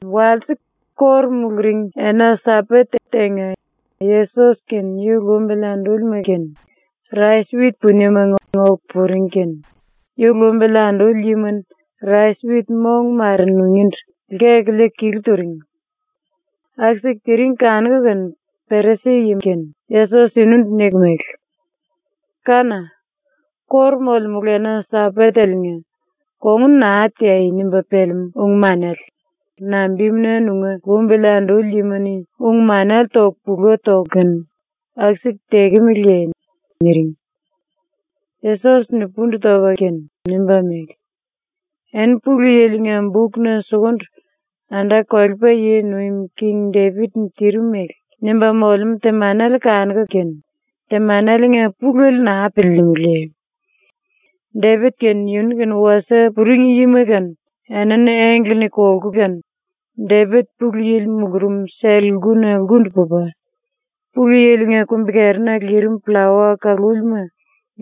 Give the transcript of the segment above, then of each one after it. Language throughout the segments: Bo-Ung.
Walse, ⸤kóru muluring⸥ ena-Sambat tenga, Yesos kene yu lumbili andúlima kene rais-wit puniemanga oku puring kene yu lumbili anduli yima-ni rais-wit mong mare nungíndu lkeku liiku kilu turing. Aku-siku tiring kanuku kene Perisi-yima-ni Yesos yunundu niku mele: “Kána! ⸤Kóru molemulu⸥ ena-Sambateliinga ‘Kongun naa teai.’ nimba pelemú ung-manele nambimuna nunga lumbili anduli yima-ni ung-manele toku pula toku kene aku-siku tekemeleye?” niring. Yesos-ni pundu topa kene nimba mele: “Eni Pulu Yili-nga bukna sukundu ⸤anda-kolepa yi nuim king⸥ Depit-ni tirim mele nimba molemú temanele kanuku kene temaneliinga pulele naa piliilimiliye? Depit kene yunu-kene wasie puring yima kene enini engle-ni kolku kene, Depit Pulu Yili mulurum sell-lkuna lkundu pupa, Pulu Yili-nga kumbi-kerina lirim pllawa kalúlima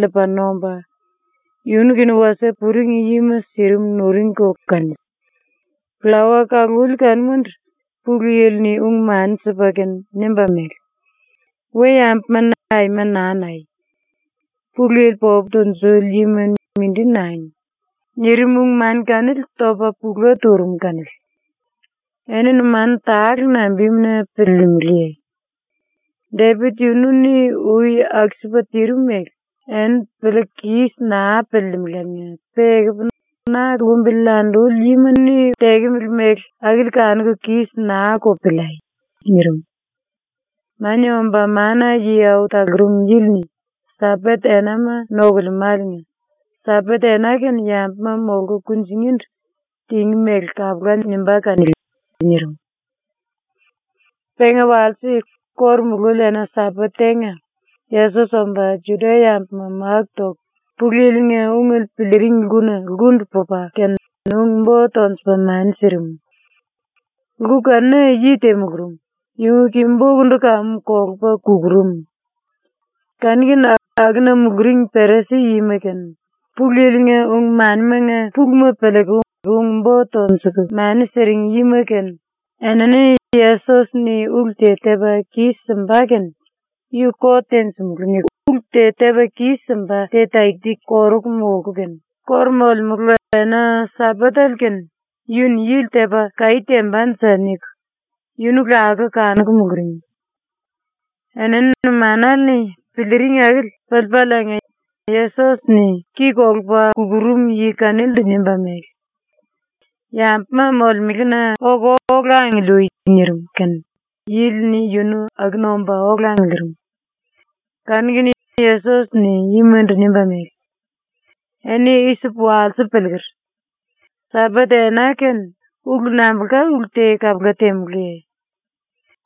liipa nomba, yunu-kene wasie puring yima sirim nuringko kanili. Pllawa kaluli kanumandu Pulu Yili-ni ung-mani sipa kene nimba mele: “We-yambuma-ni aima naa nai. Pulu Yili popu tunjuli yima mindi nangi.” nirim ⸤ung-mani kanili topa pula turum⸥ kanili. ⸤Eni numanu tale nambimuna piliilimiliye? Depit yunu-ni ui aku-sipa tirim mele eni piliiku kis naa piliilimiláliinga, pe ekupu na lumbili anduli yima-ni tekemele mele akili kanuku kis naa-ko piliai.⸥” nirim. “Mania Omba Mana-Yi Au Talurum Yili-ni Sambat enama nokulemáliinga ⸤Sambat ena kene yambuma molku kunjingíndu tingí mele kapula nimbá kanili⸥.” nirim. Penga walse, kóru mululi ena-Sambat tenga, Yesos omba Juda-yambuma máku toku Pulu Yili-nga ungele piliiring lkuna lkundu pupa kene ung-bo tonjupa mani sirim. Lku kanuna yi te mulurum, yunga ki-bokundu kamu kolupa kukurum. Kanu-kene akuna muluring Perisi-yima kene, Pulu Yili-nga ung-manimanga puluma piliiku ung-bo tonjuku mani siring yima kene, enini ‘Yesos-ni ulu te tepa kis-simba kene yu kot tenjimulú.’ niku ulu te tepa kis-simba te ⸤taki-taki koruku molku kene⸥ ‘⸤Kóru molemulu⸥ ena-Sambatele kene yu-ni yili tepa kaí tembanje.’ niku yunu lakuku kanuku muluring. Enini numanale-ni piliiring akili piliipaliinga Yesos-ni ki kolupa kukurum yi kanilindu nimba mele: “Yambuma molemelena oku ola angiliui.” nirim kene yili yunu akuna omba ola angiliirim. Kanu-kene Yesos-ni yimandu nimba mele: “Eni i-sipu walsipu piliiker. ‘Sambat ena kene ulu nambulka ulu te kapula temulúye?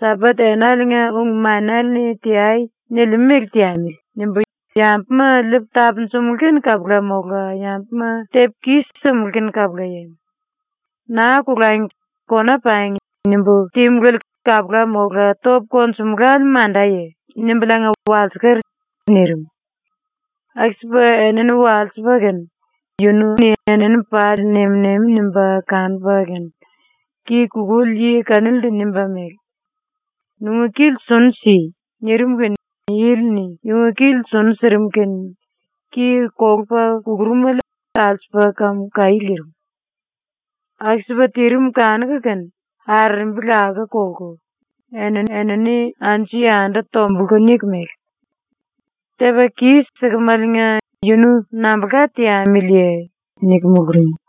‘Sambat enaliinga ung-manele-ni “Teai.” nilimú mele teamili.’ nimbu yambuma liipu tapunjumulú kene kapula mola yambuma tepu kis-simulú kene kapulaye? ‘Naa kolangi. Kona pangi.’ nimbu temulále kapula mola topu konjumulále mandaye?’ nimbuliinga walsiker.” nirim. Aku-sipa enini walsipa kene yunu-ni enini pali nem-nemi nimba kanupa kene ki kukuli yi kanilindu nimba mele: “Nunga kili sunu si.” nirim kene yili-ni yunga kili sunu sirim kene ki kolupa kukurumele alsupa kamu kaí lirim. Aku-sipa tirim kanuku kene arerembi lakuku kolku eni-enini anju-yandu tombulku niku mele: “Tepa kis-sikimeliinga yunu nambulka teamiliye?” niku muluring.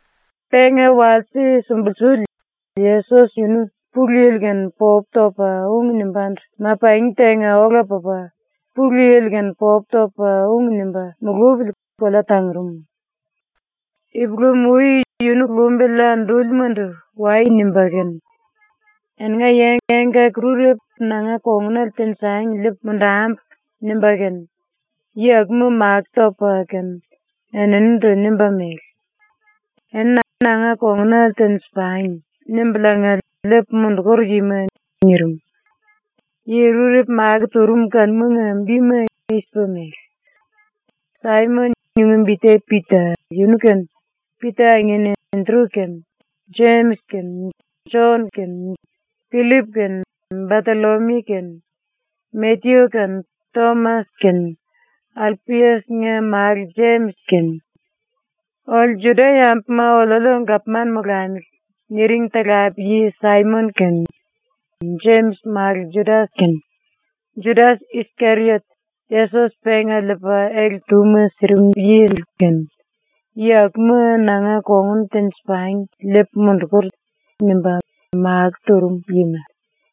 Penga walse sumbulsuli Yesos yunu Pulu Yili-kene popu topa ung nimbándu ma-pangi tenga ola pupa Pulu Yili-kene popu topa ung nimba mulupili kolea tangurum. Ipulam-ui yunu lumbili andúlimandu “Wai.” nimba kene ‘Eninga yi engkaki-rurepu nanga kongunale tenjangi liipu mundambu.’ nimba kene yi akuma makó topa kene eninindu nimba mele: “Eni ‘Nanga kongunale tenji-pangi.’ nimbuliinga liipu mundukur yima.” nirim. ⸤Yi rurepu makó turum kanumanga bima i-sipa mele:⸥ Saimon (yunga bi te Pita) yunu kene, Pita angin Endru kene, Jemis kene, Jon kene, Pillip kene, Batollomiu kene, Matyu kene, Tomas kene, Alpias-nga málu Jemis kene, “Oliu Juda-yambuma oliuliu gapman molamili.” niring talape-yi Saimon kene, Jemis málu Judas kene, Judas-Iskeriot, Yesos penga liipa ele-túma sirim yili kene, ⸤yi akuma ‘nanga kongun tenji-pangi liipu mundukur.’ nimba makó turum yima⸥.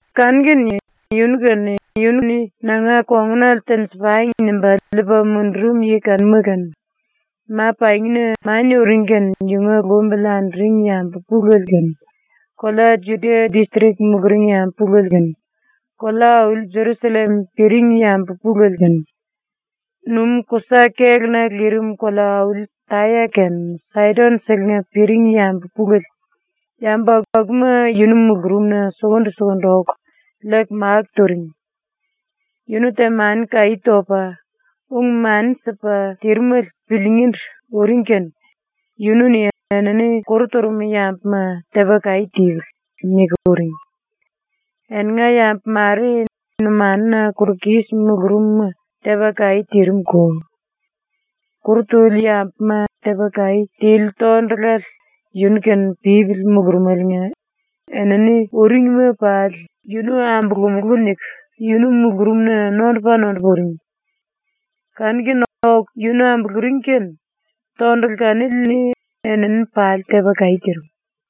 Kanu-kene yunu kene, yunu-ni “Nanga kongunale tenji-pangi.” nimba liipa mundurum yi kanuma kene, ma-pangina mania uring kene yunga lumbili anduring yambu pulele kene, kolea Judia distrik muluring yambu pulele kene, kolea-auli Jerusallem piring yambu pulele kene, numú-kusa kéluna lirim kolea-auli Taya kene Saidon-selenga piring yambu pulele, yambu akuma yunu mulurumna sukundu-sukundu oku liiku máku turing. Yunu temani-kaí topa, ung-mani sipa tirimele piliingíndu uring kene, yunu-ni enini kuru turum yambuma ‘Tepa kaí tipili.’ niku uring. Eninga yambu mare numanuna kuru kis mulurumuma tepa kaí tirim-ko. Kuru tuli yambuma tepa kaí tili tondulale yunu-kene pípili mulurumeliinga enini uringma pali ‘Yunu ambulumulú.’ niku yunu mulurumna nondupa-nondupa uring. Kanu-kene oku yunu ambuluring kene tondulu kanili-ni enini pali tepa kaí tirim.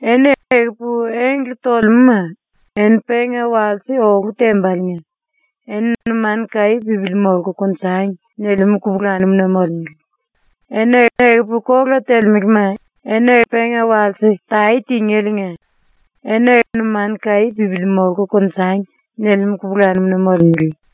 “Eni ekupu engle tolemúma eni penga walse olu tembaliinga eni “Numanu kaí pípili molku konjangi.” nilimú kupulanum-na molemele. “Eni ekupu kola telemelema eni penga walse tae tingéliinga eni “Numanu kaí pípili molku konjangi.” nilimú kupulanum-na molemele.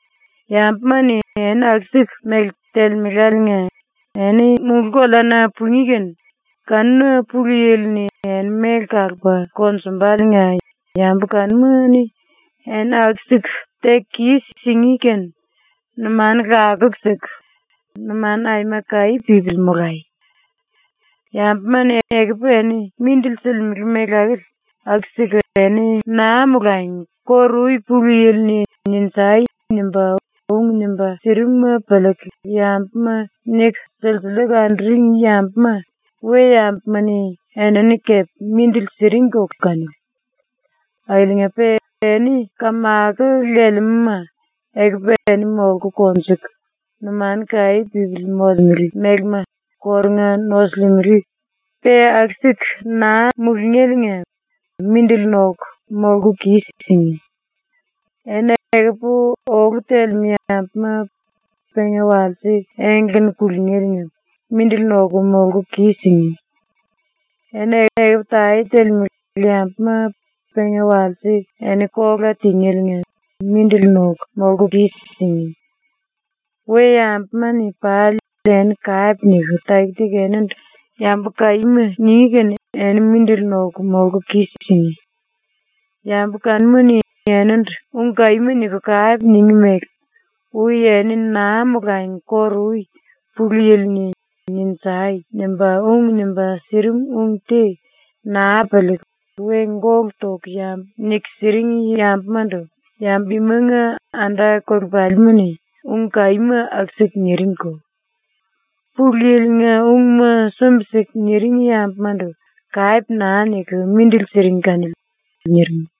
“⸤Yambuma-ni eni aku-siku mele telemeláliinga⸥ eni mulú-koleana pungí kene kanuna ⸤Pulu Yili-ni⸥ eni méle kalupa konjumbaliinga ⸤yambu kanuma-ni eni aku-siku teku kis-singí⸥ kene numanu lakuku siku, numanu aima kaí pípili molai. Yambuma-ni ekupu eni mindili silimele mele akili, aku-siku eni naa molangi kóru-ui Pulu Yili-ni “Ninjai!” nimba ung nimba sirimuma piliiku yambuma niku silsiliiku anduring yambuma we-yambuma-ni enini kepe mindili siringko kanili. “Akiliinga-pe eni kamako lelemelema, ekupu eni molku konjuku numanu kaí pípili molemele mélema kórunga nosulimele, pe aku-siku naa mulungéliinga mindili noku molku kis-singí. Eni ekupu olu telemú yambuma penga walse engle-ni kulungéliinga mindili noku molku kis-singí. Eni ekupu tae telemele yambuma penga walse eni kola tingéliinga mindili noku molku kis-singí. We-yambuma-ni pali eni kape niku taki-taki enindu “Yambu kaíma.” ningí kene eni mindili noku molku kis-singí. Yambu kanuma-ni enindu ung kaíma niku kape ningí mele ui eni naa molangi kóru-ui Pulu Yili-ni “Ninjai!” nimba ung nimba sirim ung te naa piliiku we gólu toku yambu niku siring yambumandu yambu imanga anda-kolepalima-ni ung kaíma aku-siku niringko. ⸤Pulu Yili-nga ungma sumbi-siku niring yambumandu kape naa niku mindili siring kanili.⸥” ⸤nirim.⸥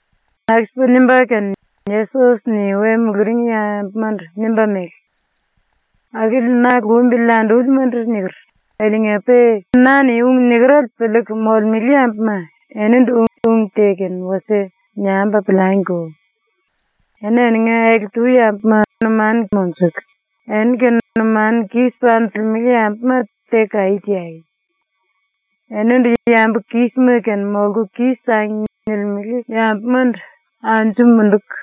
⸤Aku-sipa nimba kene Yesos-ni we muluring yambumandu nimba mele:⸥ “⸤Akili na lumbili andúlimandu niker⸥ akiliinga-pe na-ni ung nikerele piliiku molemele yambuma, enindu ung te kene wasie niambu piliangiko. Eni eninga ele-tu yambuma numanu monjuku, eni-kene numanu kis panjilimele yambuma teku kaí teai. Enindu ‘Yambu kísima kene molku kis-sangi.’ nilimele yambumandu anju munduku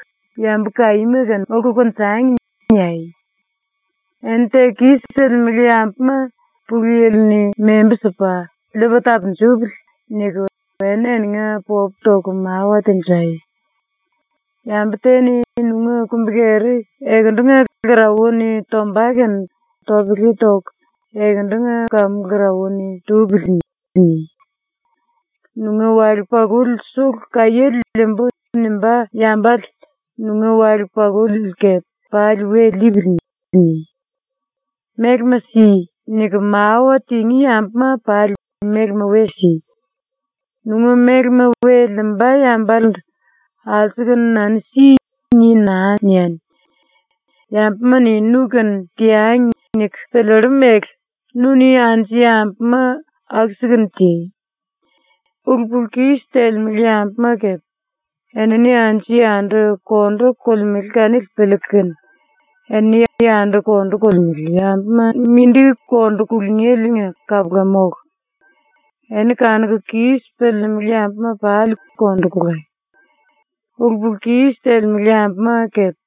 ‘Yambu kaíma kene molku konjangi.’ niai. Eni teku kis-silimele yambuma ‘Pulu Yili-ni membu sipa liipa tapunjupili.’ niku eni eninga popu toku mawa tenjai. “Yambu te-ni nunga kumbi-keri ekendunga lkarauwa-ni tomba kene topele toku ‘Ekendunga kamu lkarauwa-ni tupili.’ ni. ‘Nunga wale-pakuli sulu kaiéle liimbú.’ nimbá yambale nunga wale-pakuliele kepe ‘pali we liipili.’ ni. “Mélema si.” niku mawa tingí yambuma pali mélema we si. Nunga mélema we liimba yambalendu “Alsukunu nanu si.” ni naa niani. “‘Yambuma-ni nu-kene teangi.’ niku piliillu mele, nu-ni anju yambuma aku-sikunu ti. “Ulu-pulu-kis telemele yambuma kepe enini anju-yandu kondu kolemele kanili piliiku kene eni yandu kondu kolemele yambuma mindi kondu kulungéle kapula mólu. Eni kanuku kis piliilimili yambuma pali kondu kolai. Ulu-pulu-kis telemele yambuma kepe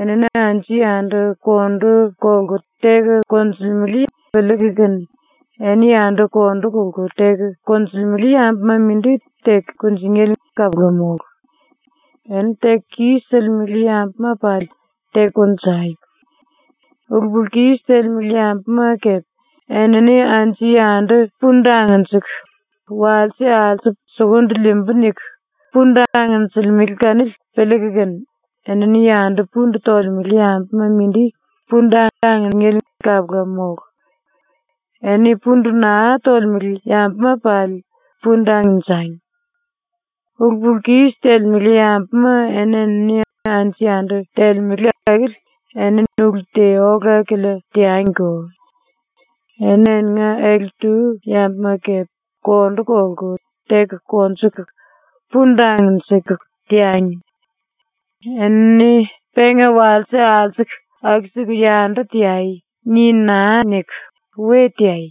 enini anju-yandu kondu kolku teku konjulemele piliiku kene eni yandu kondu kolku teku konjulemele yambuma mindi teku kunjingéle kapula mólu. Eni teku kis-silimele yambuma pali teku konjai. Ulu-pulu-kis telemele yambuma kepe enini anju-yandu pundu angnjiku, ‘Walse alsupu sukundu liimbu.’ niku pundu angnjilimele kanili piliiku kene, eni yandu pundu tolemele yambuma mindi pundu angnjingéle kapula mólu. Eni pundu naa tolemele yambuma pali pundu angnjangi. “⸤Ulu-pulu-kis telemele yambuma enini anju-yandu telemele akili eni ulu te ola-kilia teangiko.⸥ Eni eninga ele-tu yambuma kepe kondu kolku, teku konjuku, pundu angnjiku, teangi. ‘Enini penga walse alsuku aku-siku yandu teai.’ ni naa niku, we teai.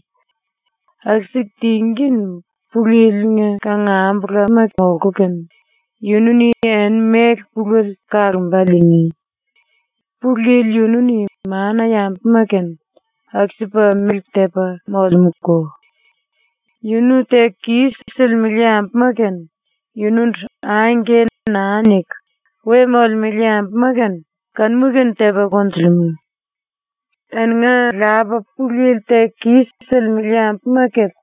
Aku-siku tingí kene Pulu Yili-nga kangambulama molku kene, yunu-ni eni méle pulele kalomba liingí. Pulu Yili yunu-ni mana-yambuma-kene aku-sipa mele tepa molemúko. Yunu teku kis-silimele yambuma kene, yunundu ‘Angke’ naa niku we molemele yambuma kene kanuma tepa konjulimú. Eninga Lapa Pulu Yili teku kis-silimele yambuma kepe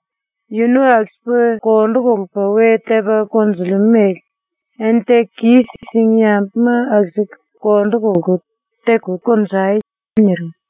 yunu aku-sipa kondu kolupa we tepa konjulimú mele eni teku kis-singí yambuma aku-siku kondu kolku teku konjai.” ⸤nirim⸥.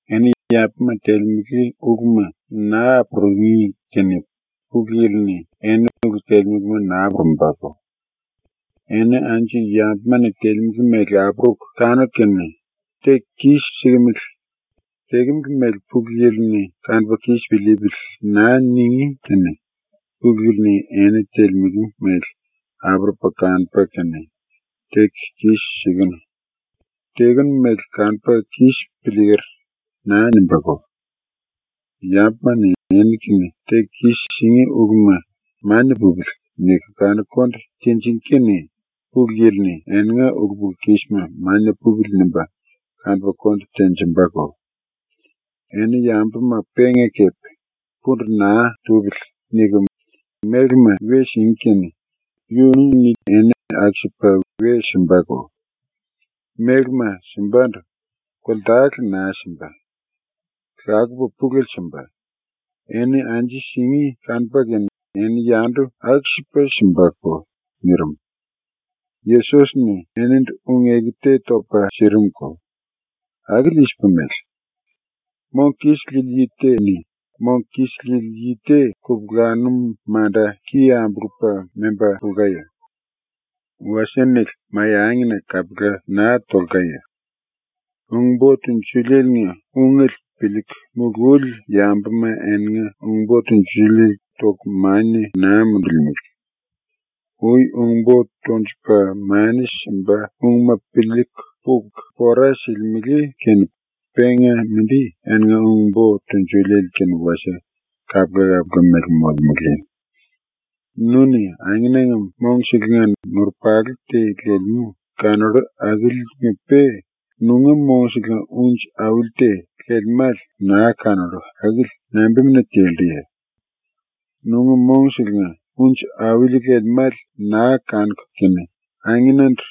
“Eni yambuma telemele uluma naa apurungí kene ⸤Pulu Yili-ni⸥ eni ulu telemelema naa apurumbako. Eni anju yambuma-ni telemele mele apuruku kanuku kene “Teku kis-sikimili. Tekemele mele ⸤Pulu Yili-ni⸥ kanupa kis piliipili.” naa ningí kene ⸤Pulu Yili-ni⸥ eni telemele mele apurupa kanupa kene “Teku kis-sikenu. Tekenu mele kanupu kis piliiker.” naa nimbáko. Yambuma-ni eni-kene teku kis-singí uluma ‘Mania pupili.’ niku kanuku konde tinjingí kene ⸤Pulu Yili-ni⸥ eninga ulu-pulu-kisma ‘Mania pupili.’ nimba kanupa konde tenjimbako. Eni yambuma penga kepe ‘Pundu naa tupili.’ niku mélema we singí kene yunu-ni eni aku-sipa we simbako. Mélema simbandu koltale naa simba; lakupa pulele simba. Eni anju singí kanupa kene eni yandu aku-sipa simbako.” nirim. Yesos-ni eninindu ung-eku te topa sirimuko. Akili i-sipa mele: “Mong kis lili yi te-ni mong kis lili yi te kupulanum manda ki ambulupa memba pulkaye? Wasie-nele mai-angina kapula naa tolkaye? Ung-bo tunjuliele-nga ungele piliiku mululi yambuma eninga ung-bo tunjuliele toku mania naa mundulimele. Ui ung-bo tonjupa mani simba ungma piliiku puku pora silimele kene penga mindi eninga ung-bo tunjuliele-kene wasie kapula-kapula mele molemele. “Nu-ni angenanga mongselenga nurupalu te lelemú kanollu akiliinga-pe nunga mongselenga unji auli te lelemále naa kanollu akili nambimuna telluye? Nunga mongselenga unji auli lelemále naa kanuku kene angenandu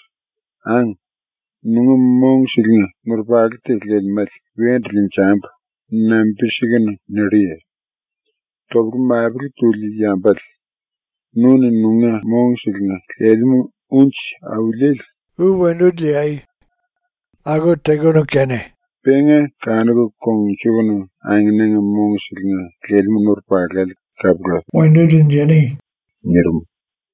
“Ang, nunga mongselenga nurupalu te lelemále wendu liinjambu.” nambi-sikunu nilluye? Topele-mapele tuli yambale, nu-ni nunga mongselenga lelemú unji auliele ui wendu liikunu kene penga kanuku kongnjukunu angenanga mongselenga lelemú nurupalale kapula wendu liinjani.” ⸤nirim.⸥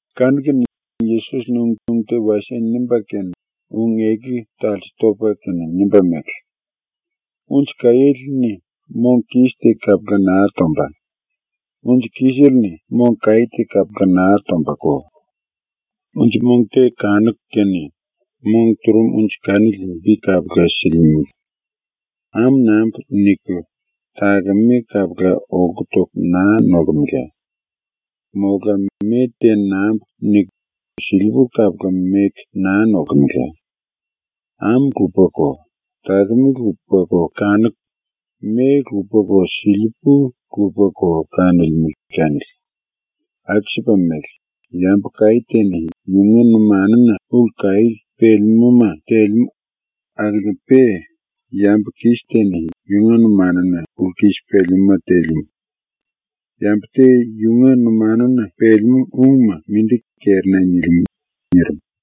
⸤Kanu-kene Yesos-ni ung te wasie nimba kene ung-eku talse topa kene nimba mele:⸥ “Unji-kaiéle-ni mong kis te kapula naa tomba; unji kisele-ni mong kaí te kapula naa tombako. Unji mong te kanuku kene mong turum unji kanili bi kapula silimele. ‘Ámu nambu.’ niku, takeme kapula olku toku naa nolkemela. Mola ‘Me te nambu.’ niku, silipú kapula meku naa nolkemela. Ámu lupako takeme lupako kanuku, me lupako silipú lupako kanolemele kanili. Aku-sipa mele, yambu kaí te-ni yunga numanuna ulu kaí pelemúma telemú, akiliinga-pe yambu kis te-ni yunga numanuna ulu kis pelemúma telemú. Yambu te yunga numanuna pelemú ungma mindi kerina nilimú.” ⸤nirim.⸥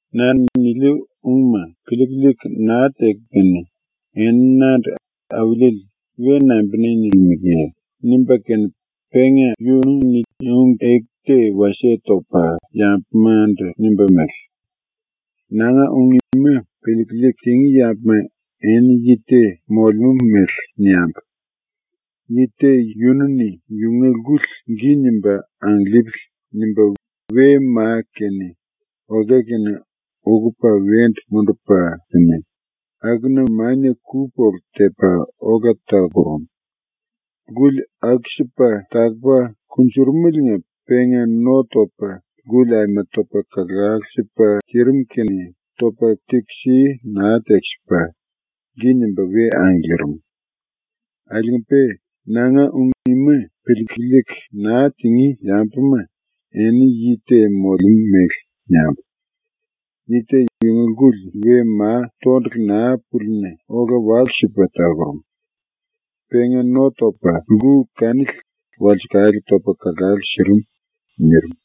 “Na-ni niliu ungma piliiku liiku naa teku kene eni nandu “Auliele” we nambimuna nilimeleye?” ⸤nimba kene penga yunu-ni ung-eku te wasie topa yambumandu nimba mele:⸥ “Nanga ung ima piliiku liiku tingí yambuma eni yi te molemú mele niambu: Yi te yunu-ni yunga lkuli ‘Gi nimba angiliipili.’ nimba we ma kene okea kene ukupa wendu mundupa kene, akuna mania ku-polu tepa ola takurum. Lkuli aku-sipa takupa kunjurumeliinga penga no topa lkuli aima topa kalalu sipa tirim kene topa tekisi naa tekisipa gi nimba we angiliirim. “Akiliinga-pe nanga ung ima piliiku liiku naa tingí yambuma eni yi te molemú mele niambu: Yi te yunga lkuli we ma tondulu naa púlina ola walu-sipa takurum. Penga no topa lku kanili walsekale topa kalalu sirim.” nirim.